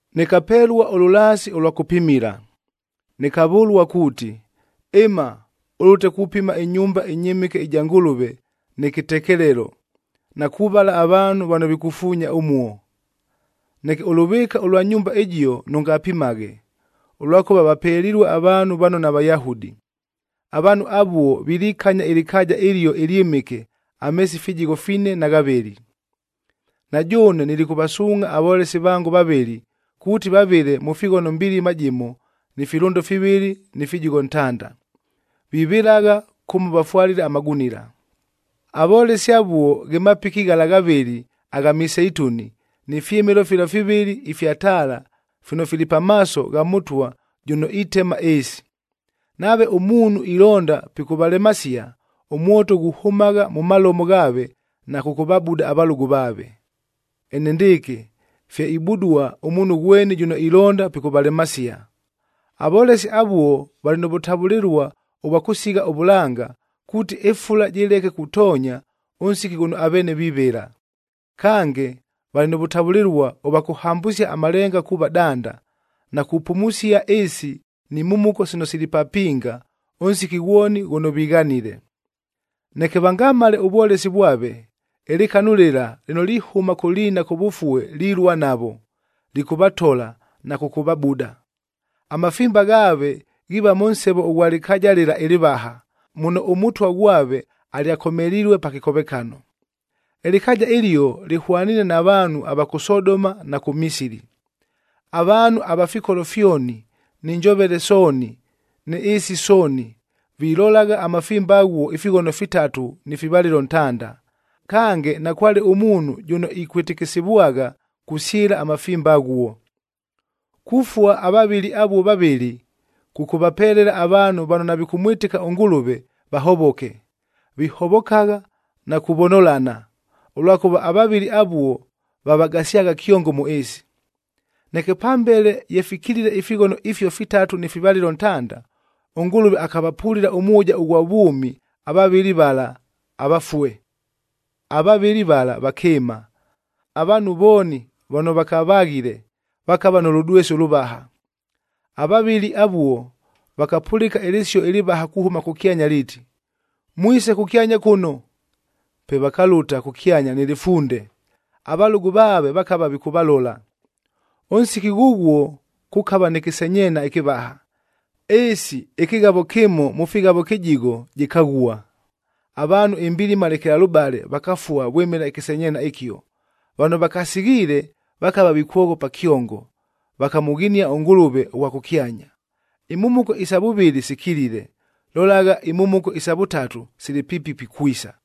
Nɨkapelua ʉlʉlaasi ʉlwa kʉpimila. Nɨkavʉlua kuuti, “Ɨma ʉlʉte kupima ɨnyumba ɨnyɨmɨke ɨja Ngʉlʉvea nɨ kɨtekelelo, na kuvala avaanhu vano vikufuunya ʉmuo. Neke ʉlʉvɨɨka ʉlwa nyumba ɨjio nʉngapimaghe, ʉlwakʉva vapelilue avaanhu vano naVayahudi. Avaanhu avuo vilikanya ɨlɨkaaja ɨlio ɨlyɨmɨke ameesi fijigho fine na ghavɨlɨ. Na jʉʉne nilikʉvasuungʼha avolesi vango vavɨlɨ, kuuti vavɨle mʉ fighono mbilima jɨmo ni filʉndo fivɨlɨ ni fijigho ntanda. Vivɨlagha kʉmo vafwalile amagunila.” Avolesi avuo ghe mapiki ghala ghavɨlɨ agha miseituni ni fyɨmɨlo fila fivɨlɨ ifya taala fino fili pamaaso gha Mʉtwa jʉno itema ɨɨsi. Nave ʉmuunhu ilonda pikʉvalemasia, ʉmwoto ghuhʉmagha mʉ malomo ghaave na kʉkʉvabuda avalʉgʉ vaave. Enendɨɨkɨ fye ibudua ʉmuunhu ghweni jʉno ilonda pikʉvalemasia. Avolesi avuo valɨ nʉ vʉtavʉlɨlua ʉvwa kʉsigha ʉvʉlanga, kuuti ɨfula jɨleke kutoonya ʉnsiki ghʉno aveene vivɨla. Kange, valɨ nʉ vʉtavʉlɨlua ʉvwa kʉhambʉsia amalenga kuuva danda, na kupumusia ɨɨsi ni mhumuko sino sili papinga ʉnsiki ghwoni ghʉno vighanile. Neke vangamale ʉvwolesi vwave, ɨlɨkanu lɨla lɨno lihʉma kʉ liina kʉvʉfue lilua navo, lɨkʉvatola na kʉkʉvabuda. Amafimba ghaave ghiiva mʉ nsevo ʉghwa lɨkaaja lɨla ɨlɨvaha, muno ʉMʉtwa ghwave alyakomelilue pa kɨkovekano. Ɨlɨkaaja ɨlio lɨhwaniine na vaanhu va kʉ Sodoma na kʉ Misili. Avaanhu ava fikolo fyoni ni njovele sooni ni ɨɨsi sooni, vilolagha amafimba aghuo ifighono fitatu ni fivalɨlo ntanda, kange nakwale ʉmuunhu jʉno ikwɨtɨkɨsivwagha kusyɨla amafimba aghuo. Kufua avavɨli avuo vavɨlɨ, kʉkʉvapelela avaanhu vano navikʉmwɨtɨka ʉNgʉlʉve vahovoke. Vihovokagha na kuvonolana, ʉlwakʉva avavɨli avuo vavagasyagha kyongo mʉ ɨɨsi. Neke pambele ye fikilile ifighono ifio fitatu ni fivalɨlo ntanda, ʉNgʉlʉve akavapulila ʉmwʉja ʉghwa vwʉmi avavɨli vala avafue. Avavɨli vala vakɨɨma. Avaanhu vooni vano vakavaghile, vakava nʉ lʉdwesi ʉlʉvaha. Avavɨli avuo vakapʉlɨka ɨlɨsio ɨlɨvaha kuhʉma kʉkyanya liiti, “Mwise kʉkyanya kʉno!” Pe vakalʉta kʉkyanya nɨ lɨfunde, avalʉgʉ vaave vakava vikʉvalola. Ʉnsiki ghʉghuo kʉkava nɨ kɨsenyeena ɨkɨvaha. Ɨɨsi ɨkɨghavo kɨmo mʉ fighavo kɨjigho, jɨkaghua. Avaanhu imbilima lekelalʉbale vakafua vwɨmɨla ɨkɨsenyeenya ɨkio. Vano vakasighiile vakava vikwoghopa kyongo, vakamʉghinia ʉNgʉlʉve ʉghwa kʉkyanya. Imhumuko isa vʉvɨlɨ sikilile, lolagha, imhumuko isa vʉtatu sili piipi pikwisa.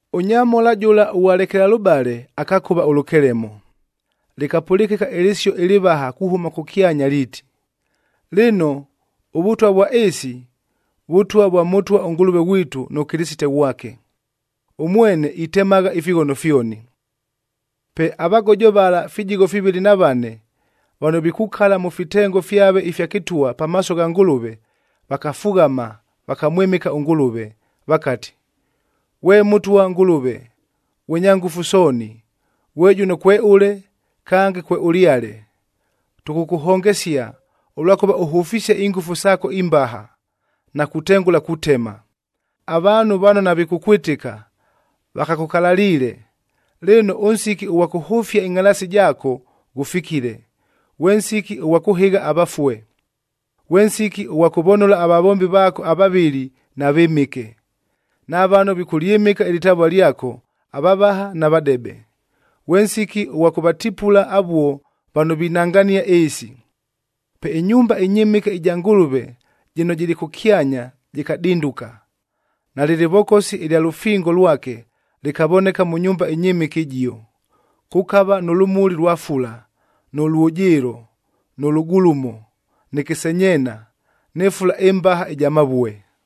Ʉnyamhola jʉla ʉghwa lekelalʉbale akakʉva ʉlʉkelemo. Lɨkapʉlɨkɨka ɨlɨsio ɨlɨvaha kuhʉma kʉkyanya liiti, “Lɨno, ʉvʉtwa vwa ɨɨsi, Vʉtwa vwa Mʉtwa ʉNgʉlʉve ghwitu nʉ Kɨlɨsite ghwake. Ʉmwene itemagha ifighono fyoni.” Pe avagojo vala fijigho fivɨlɨ na vane vano vikukala mʉ fitengo fyave ifya kɨtwa pamaaso gha Ngʉlʉve, vakafughama, vakamwɨmɨka ʉNgʉlʉve, vakati, “Ghwe Mʉtwa Ngʉlʉve, ghwe Nyangʉfu Sooni, ghwe jʉno kweʉle kange kweʉlyale, tʉkʉkʉhongesia, ʉlwakʉva ʉhʉfisie ingʉfu saako imbaha, na kutengʉla kutema. Avaanhu vano navikʉkwɨtɨka, vakakʉkalaliile. Lɨno, ʉnsiki ʉghwa kʉhʉfia ɨngʼhalaasi jaako ghʉfikile, ghwe nsiki ʉghwa kʉhɨgha avafue, ghwe nsiki ʉghwa kʉvonola avavombi vaako avavɨli na vɨmɨke, na vano vikʉlyɨmɨka ɨlɨtavua lyako, avavaha na vadebe. Ghwe nsiki ʉghwa kʉvatipula avuo, vano vinangania ɨɨsi.” Pe ɨnyumba ɨnyɨmɨke ɨja Ngʉlʉve jɨno jɨlɨ kʉkyanya jɨkadinduka, nalɨ lɨvokosi ɨlya lʉfingob lwake lɨkavoneka mʉ nyumba ɨnyɨmɨke ɨjio. Kʉkava nʉ lʉmuli lwa fula, nʉ lwʉjɨɨlo, nʉ lʉgulumo, nɨ kɨsenyeena, nɨ fula ɨmbaha ɨja mavue.